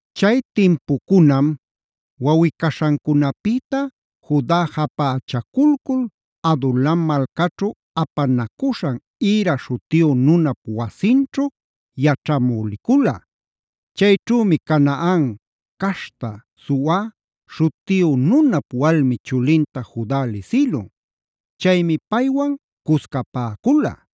Chay timpucunam wawꞌi-caśhancunapïta Juda japächaculcul Adulam malcaćhu apanacuśhan Hira śhutiyu nunap wasinćhu yaćhamü licula. Chayćhümi Canaan caśhta Sua śhutiyu nunap walmi chulinta Juda lisïlun. Chaymi paywan cuscapäcula.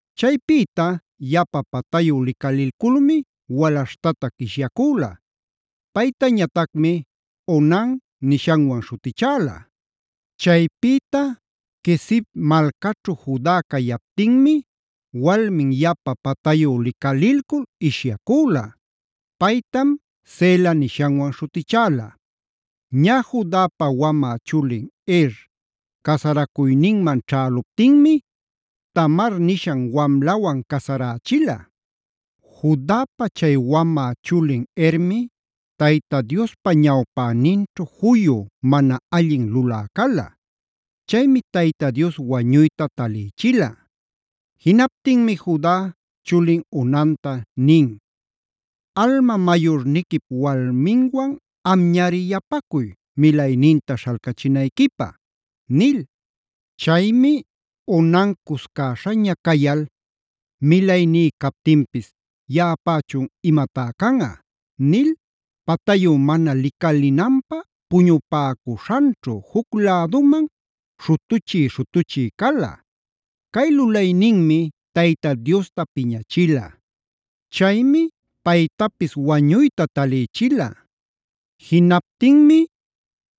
Chaypïta yapa patayu licalilculmi walaśhtatac ishyacüla. Paytañatacmi “Onan” nishanwan śhutichäla. Chaypïta Quezib malcaćhu Juda cayaptinmi walmin yapa patayu licalilcul ishyacüla. Paytam “Sela” nishanwan śhutichäla. Ñä Judapa wamä chulin Er casaracuyninman ćhäluptinmi Tamar nishan wamlawan casarächila. Judapa chay wamä chulin Ermi Tayta Diospa ñawpäninćhu juyu mana allin lulä cala. Chaymi Tayta Dios wañuyta talïchila. Jinaptinmi Juda chulin Onanta nin: “Alma mayurniquip walminwan amñari yapacuy milayninta śhalcachinayquipä”a nil. Chaymi Onan cuscäśhaña cayal: “Milayní captinpis yaꞌapächun imatá canꞌa” nil patayu mana licalinanpä puñupäcuśhanćhu juc läduman śhutuchï-śhutuchï cala. Cay lulayninmi Tayta Diosta piñachila. Chaymi paytapis wañuyta talïchila. Jinaptinmi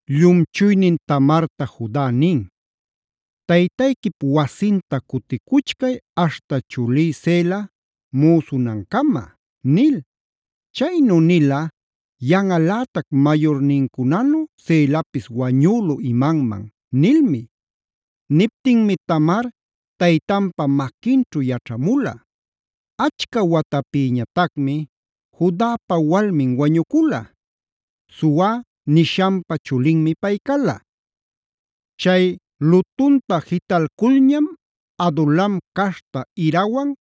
llumchuynin Tamarta Juda nin: “Taytayquip wasinta cuticuchcay aśhta chulí Sela müsunancama” nil. Chaynu nila “Yanꞌalätac mayurnincunanu Selapis wañülu imanman” nilmi. Niptinmi Tamar taytanpa maquinćhu yaćhamula. Achca watapïñatacmi Judapa walmin wañucula. Sua nishanpa chulinmi pay cala. Chay lutunta jitalculñam Adulam caśhta Hirawan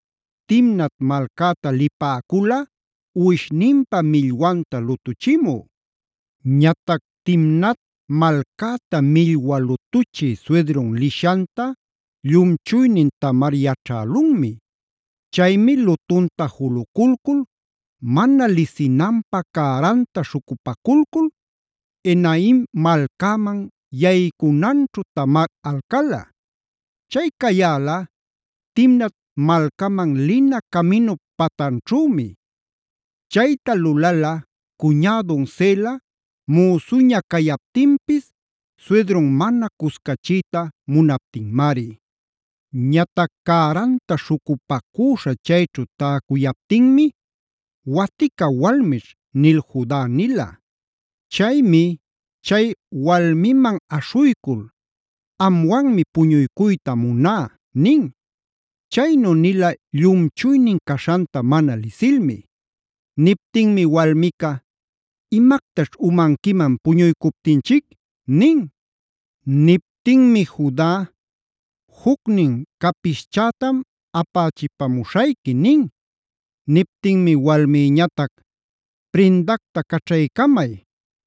Timnat malcäta lipäcula uwishninpa millwanta lutuchimü. Ñatac Timnat malcäta millwa lutuchï suydrun lishanta llumchuynin Tamar yaćhälunmi. Chaymi lutunta juluculcul mana lisinanpä cäranta śhucupaculcul Enaim malcäman yaycunanćhu Tamar alcala. Chay cayäla Timnat malcaman lina caminup patanćhümi. Chayta lulala cuñädun Sela müsuña cayaptinpis suydrun mana cuscachiyta munaptinmari. Ñatac cäranta śhucupacüśha chayćhu täcuyaptinmi “watica walmićh” nil Juda nila. Chaymi chay walmiman aśhuycul: “Amwanmi puñuycuyta muná” nin. Chaynu nila llumchuynin caśhanta mana lisilmi. Niptinmi walmica: “Imactaćh umanquiman puñuycuptinchic” nin. Niptinmi Juda: “Jucnin capischätam apächipamuśhayqui” nin. Niptinmi walmïñatac: “Prindacta caćhaycamay,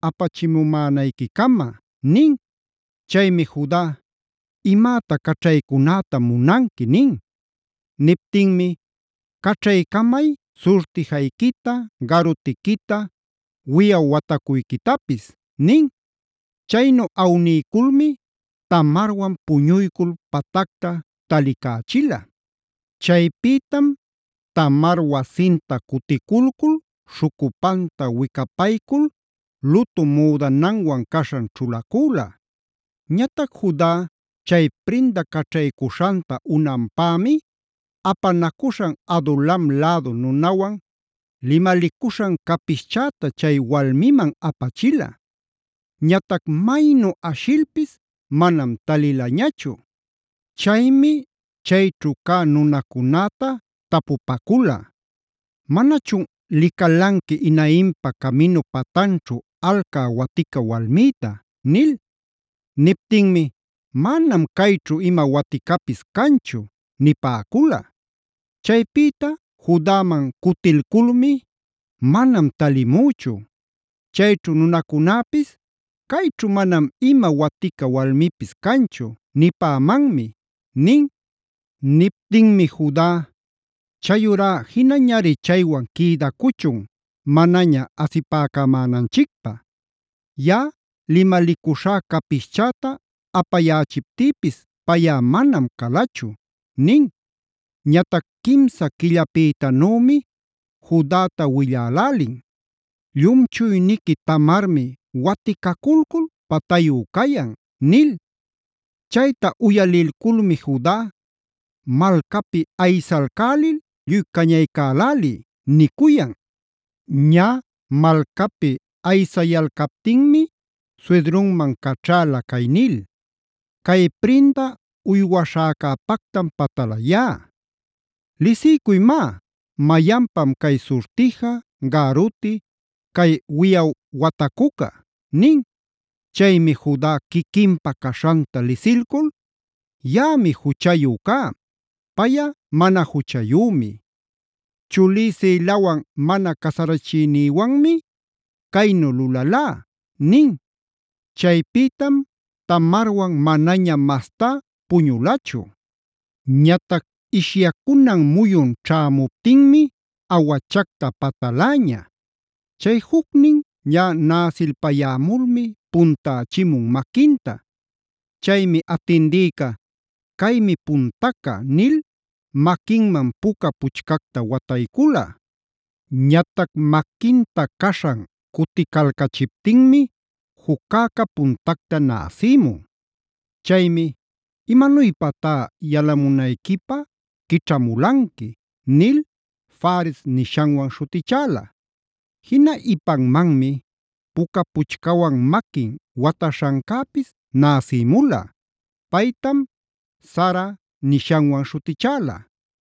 apachimumänayquicama” nin. Chaymi Juda: “¿Imäta caćhaycunätam munanqui?” nin. Niptinmi: “Caćhaycamay surtijayquita, garutiquita, wiꞌaw watacuyquitapis” nin. Chaynu awniyculmi Tamarwan puñuycul patacta talicächila. Chaypïtam Tamar wasinta cuticulcul śhucupanta wicapaycul lutu müdananwan caśhan ćhulacüla. Ñatac Juda chay prinda caćhaycuśhanta unanpämi, apanacuśhan Adulam lädu nunawan limalicuśhan capischäta chay walmiman apachila. Ñatac maynu ashilpis manam talilañachu. Chaymi chayćhu cä nunacunäta tapupacula: “¿Manachun licalanqui Enaimpa caminu patanćhu alcä watica walmïta?” nil. Niptinmi: “Manam cayćhu ima waticapis canchu” nipäcula. Chaypïta Judaman cutilculmi: “Manam talimüchu. Chayćhu nunacunäpis ‘cayćhu manam ima watica walmipis canchu’ nipämanmi” nin. Niptinmi Juda: “Chayurá jinañari chaywan quïdacuchun manaña asipäcamänanchicpä. Yaꞌa limalicuśhá capischäta apayächiptïpis payꞌa manam calachu” nin. Ñatac quimsa quillapïtanümi Judata willälälin: “Llumchuyniqui Tamarmi waticaculcul patayu cayan” nil. Chayta uyalilculmi Juda: “¡Malcapi aysalcälil lluy cañaycäläliy!” nicuyan. Ñä malcapi aysayalcaptinmi suydrunman caćhäla cay nil: “Cay prinda uywaśhäcäpactam patalayá. ¿Lisiycuy má, mayanpam cay surtija, garuti, cay wiꞌaw watacuca?” nin. Chaymi Juda quiquinpa caśhanta lisilcul: “Yaꞌami juchayu cá; payꞌa mana juchayümi. Chulí Selawan mana casarachiynïwanmi caynu lulalá” nin. Chaypïtam Tamarwan manaña mastá puñulachu. Ñatac ishyacunan muyun ćhämuptinmi awachacta pataläña. Chay jucnin ñä näsilpayämulmi puntächimun maquinta. Chaymi atindïca “Caymi puntaca” nil maquinman puca puchcacta wataycula. Ñatac maquinta caśhan cuticalcachiptinmi juccäca puntacta näsïmun. Chaymi: “¡Imanuypatá yalamunayquipä quićhamulanqui!” nil Faresb nishanwan śhutichäla. Jina ipanmanmi puca puchcawan maquin wataśhancäpis näsïmula. Paytam Zarac nishanwan śhutichäla.